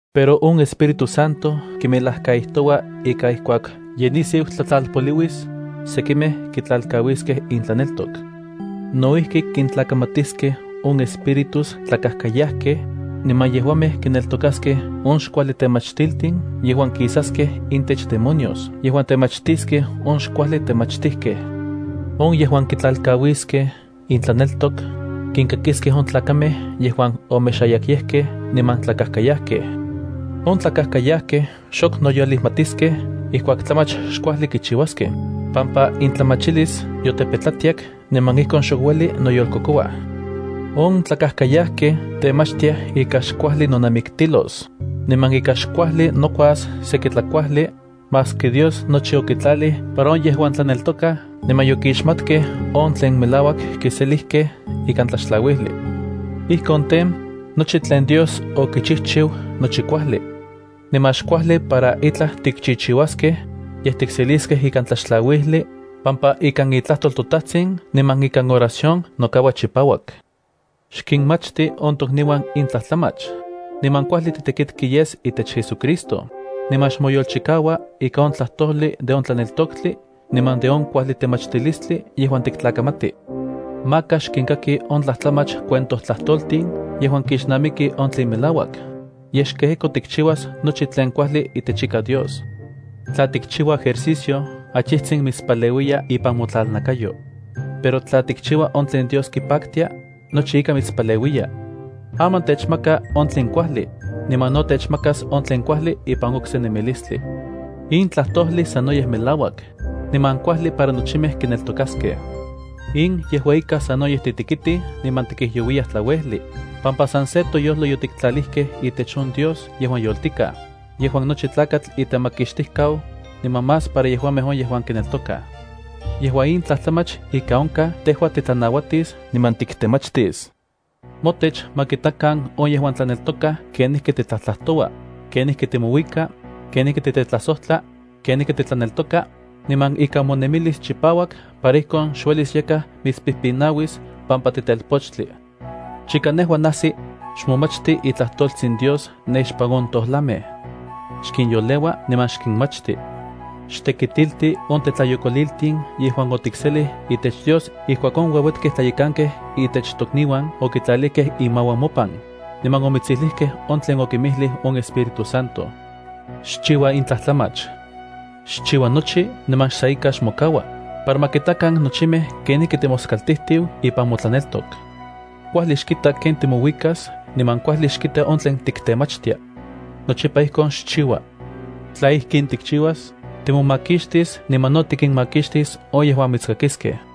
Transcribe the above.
Pero on Espíritu Santo kimelajkaijtoua ika ijkuak ye nisiu tlajtlalpoliuis, sekimej kitlalkauiskej intlaneltok. No ijki kintlakamatiskej on espíritus tlakajkayajkej, niman yejuamej kineltokaskej on xkuajli temachtiltin yejuan kisaskej intech demonios yejuan temachtiskej on xkuajli temachtijkej. On yejuan kitlalkauiskej intlaneltok, kinkakiskej on tlakamej yejuan omexayakyejkej niman tlakajkayajkej. On tlakajkayajkej xok noyolijmatiskej ijkuak tlamach xkuajli kichiuaskej, pampa intlamachilis yotepetlatiak niman ijkon xok ueli noyolkokouaj. On tlakajkayajkej temachtiaj ika xkuajli nonamiktilos, niman ika xkuajli nokuas seki tlakuajli, maski Dios nochi okitlalij para on yejuan tlaneltokaj niman yokixmatkej on tlen melauak kiseliskej ikan tlaxtlauijli. Ijkon tej, nochi tlen Dios okichijchiu nochi kuajli. Niman xkuajli para itlaj tikchichiuaskej, yej tikseliskej ikan tlaxtlauijli, pampa ikan itlajtol toTajtsin niman ikan oración nokaua chipauak. Xkinmachti on tokniuan in tlajtlamach, niman kuajli titekitki yes itech JesuCristo, niman xmoyolchikau ikan on tlajtojli de on tlaneltoktli niman de on kuajli temachtilistli yejuan tiktlakamati. Maka xkinkaki on tlajtlamach cuentojtlajtoltin yejuan kixnamiki on tlen melauak, yej xkejeko tikchiuas nochi tlen kuajli itechika Dios. Tla tikchiua ejercicio, achijtsin mitspaleuiya ipan motlalnakayo. Pero tla tikchiua on tlen Dios kipaktia, nochi ika mitspaleuiya. Aman techmaka on tlen kuajli, niman no techmakas on tlen kuajli ipan okse nemilistli. In tlajtojli sanoyej melauak, niman kuajli para nochimej kineltokaskej. In yejua ika sanoyej titekitij niman tikijyouiyaj tlauejli, pampa san se toyojlo yotiktlalijkej itech on Dios yejuan yoltikaj, yejuan nochi tlakatl itemakixtijkau, niman más para yejuamej on yejuan kineltokaj. Yejua in tlajtlamach ika onkaj tejua titlanauatis niman tiktemachtis. Motech ma kitakan on yejuan tlaneltokaj kenijki titlajtlajtoua, kenijki timouika, kenijki titetlajsojtla, kenijki titlaneltoka, niman ika monemilis chipauak para ijkon xuelis yakaj mitspijpinauis pampa titelpochtli. Chika nejua najsi, xmomachti itlajtoltsin Dios ne ixpan on tojlamej. Xkinyoleua niman xkinmachti. Xtekitilti on tetlayokoliltin yejuan otikselij itech Dios ijkuak on ueuetkej tlayekankej itech tokniuan okitlalijkej inmauan mopan, niman omitsijlijkej on tlen okinmijlij on Espíritu Santo. Xchiua in tlajtlamach. Xchiua nochi niman san ika xmokaua, para ma kitakan nochimej kenijki timoskaltijtiu ipan motlaneltok. Kuajli xkita ken timouikas niman kuajli xkita on tlen tiktemachtia. Nochipa ijkon xchiua. Tla ijkin tikchiuas, timomakixtis niman no tikinmakixtis on yejuan mitskakiskej.